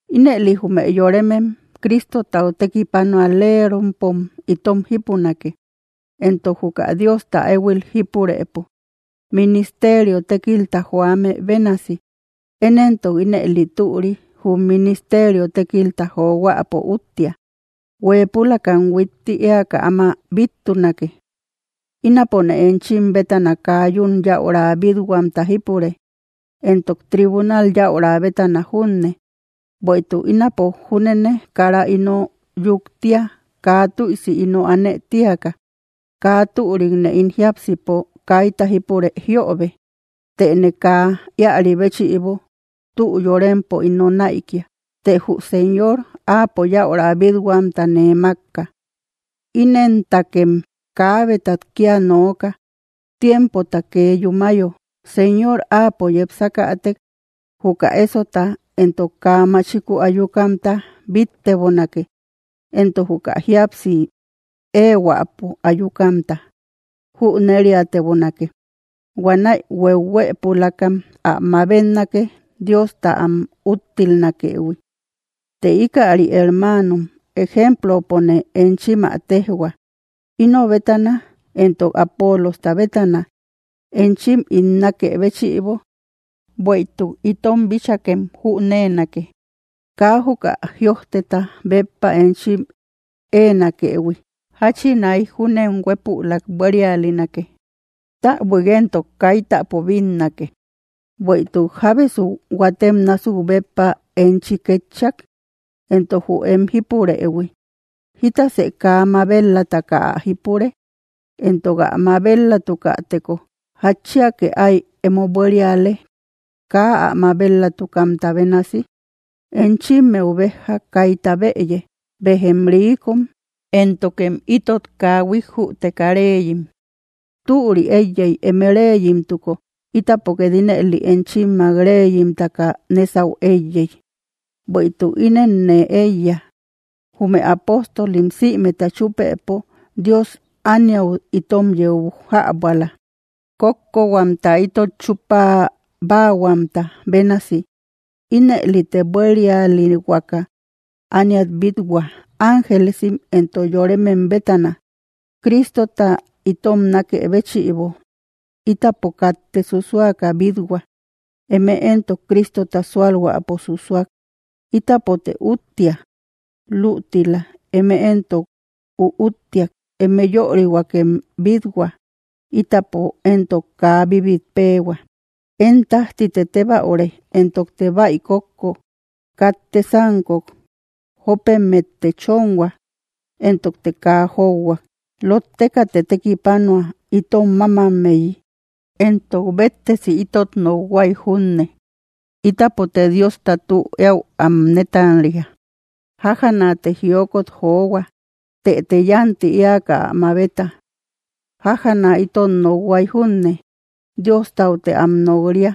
Ínëli, jume yoremem Cristotau tekipanualerompom itom jipunake, entok juka Diosta ehuil jípurëpo ministerio tékilta joame bénasi. Én entok ínëli türi, jum ministerio tékilta johuäpo úttia, huepülakam huitti eaka áma bittunake. Ínapone enchim bétana kaa yun yäura bithuamta jípure, entok tribunal yäura bétana junne, bueïtuk ínapo júnene kara ino yuktia kaa tuïsi ino aane tiaka. Kaa türikne ín jiápsipo kaita jípure jiobe, tëne kaa ïari béchïbo tü yórempo ino naïkia, të jü Señor, áapo yäura bithuamta nee makka. Inentakem, kaabetat kia nooka tiempota kee yúmayo, Señor áapo yepsakätek, juka esota entok kaa machiku ayukamta bittebonake, entok juka jíapsi ehuäpo ayukamta jüneriatebonake; huanäi huehuëpulakam ä mabetnake Diosta am úttilnakëhui. Të ikäri, hermanom, ejemplopone enchim ä tejhua, ino bétana entok Apolosta bétana, enchim ín nakë béchïbo, bueïtuk itom bíchakem jünenake, kaa juka jïojteta béppa enchim enakëhui, jachinai júnem huepulak buérialinake täbuik entok kaitäpo bínnake. Bueïtuk, ¿jábesu huatem násuk, béppa enchi ketchak? Entok jü em jipurëhui, ¿jítasë kaa mabet‑lataka ä jípure? Entok ä mabet‑latukäteko, ¿jatchiake ái emo buériale, kaa ä mabel‑latukamta bénasi? Enchimmeu béja kayta bëye, bejem riikom, éntokem itot kaa huijjuteka reeyim, ¡türi eiyey eme reeyimtuko, itapo ket ínëli enchimmak reyimtaka nesau eiyey! Bueïtuk ínen nee eiya, jume apóstolim simeta chupëpo, Dios ániau itom yeu jabuala, kókkohuamta itot chupabahuamta bénasi, ínëlite buérialihuaka ániat bithua, ángelesim entok yoremem bétana. Cristota itom nakë béchïbo, itapo katte susuaka bithua, eme entok Cristota sualhuäpo susuak; ítapote úttia lütila, eme entok üúttiak, ëme yörihuakem bithua, itapo entok kaa bibitpeehua. Én tajtite tebaüre, entokte baï kókko, katte sankok, jópemette chonhua, entokte kaa jouhuak. Lottekate tekipanua itom mamammeyi; entok béttesi ítot nokhuaï junne, ítapote Diosta tü eäu am netanria, jájanate jiokot johua, tëete yanti eaka ä mabeta. Jájana itot nokhuay junne, Diostaute am nok-ria,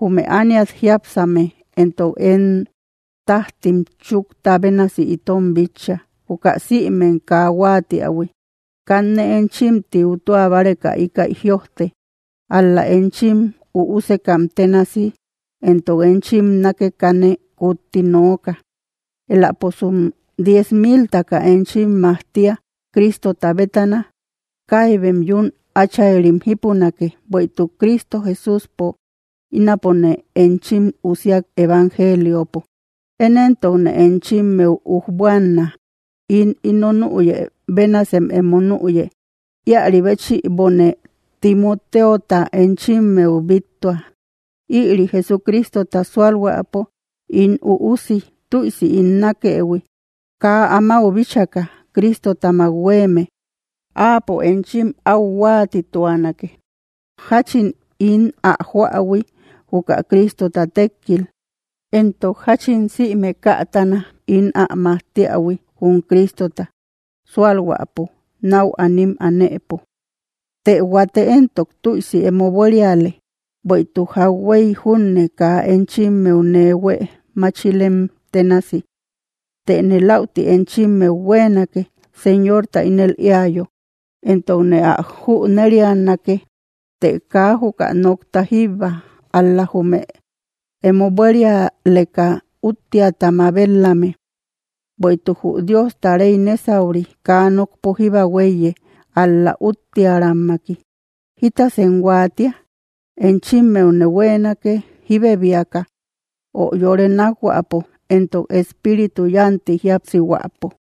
jume ániat jiápsame entok én tajtim chukta bénasi itom bitcha, juka sïmem kaa huatiahui. Kanne enchim tiutua báreka íkäi jïojte: ál‑la enchim üusekam ténasi entok enchim nákekane kutti nooka. Eläposum diez miltaka enchim majtiä Cristota bétana, kaibem yún áchayrim jipunake; bueïtuk Cristo Jesúspo ínapone enchim usiak evangeliopo. Én entokne enchimmeu ujbuanna, ín ino nüyë bénasem emo nüye. Ïari béchïbone Timoteota enchimmeu bittua, ïri Jesucristota sualhuäpo ín üusi tüisi ín nakëhui, kaa amáu bíchaka Cristotamak hueme, áapo enchim au huatituanake jachin ín ä joähui juka Cristota tekkil, entok jachin sïme kätana ín am majtiähui jum Cristota sualhuäpo nau anim anëpo. Të huate entok tüisi emo buériale, bueïtuk jauhuey júne kaa enchimmeu nee huee máchilem tenasi. Tëne laüti enchimmeu hueenake, Señorta ínel eäyo, entokne ä jünerianake, të kaa juka nokta jíbba, ál‑la jume emo buérialeka úttiata mabet‑lame. Bueïtuk jü Diosta rey nesauri, kaa nokpo jíba huéiye, ál‑la uttiäramaki. ¿Jitasem huatia? ¿Enchimmeune hueenake jibebiaka, ö yore nákhuäpo, entok espíritu yanti jíapsihuäpo?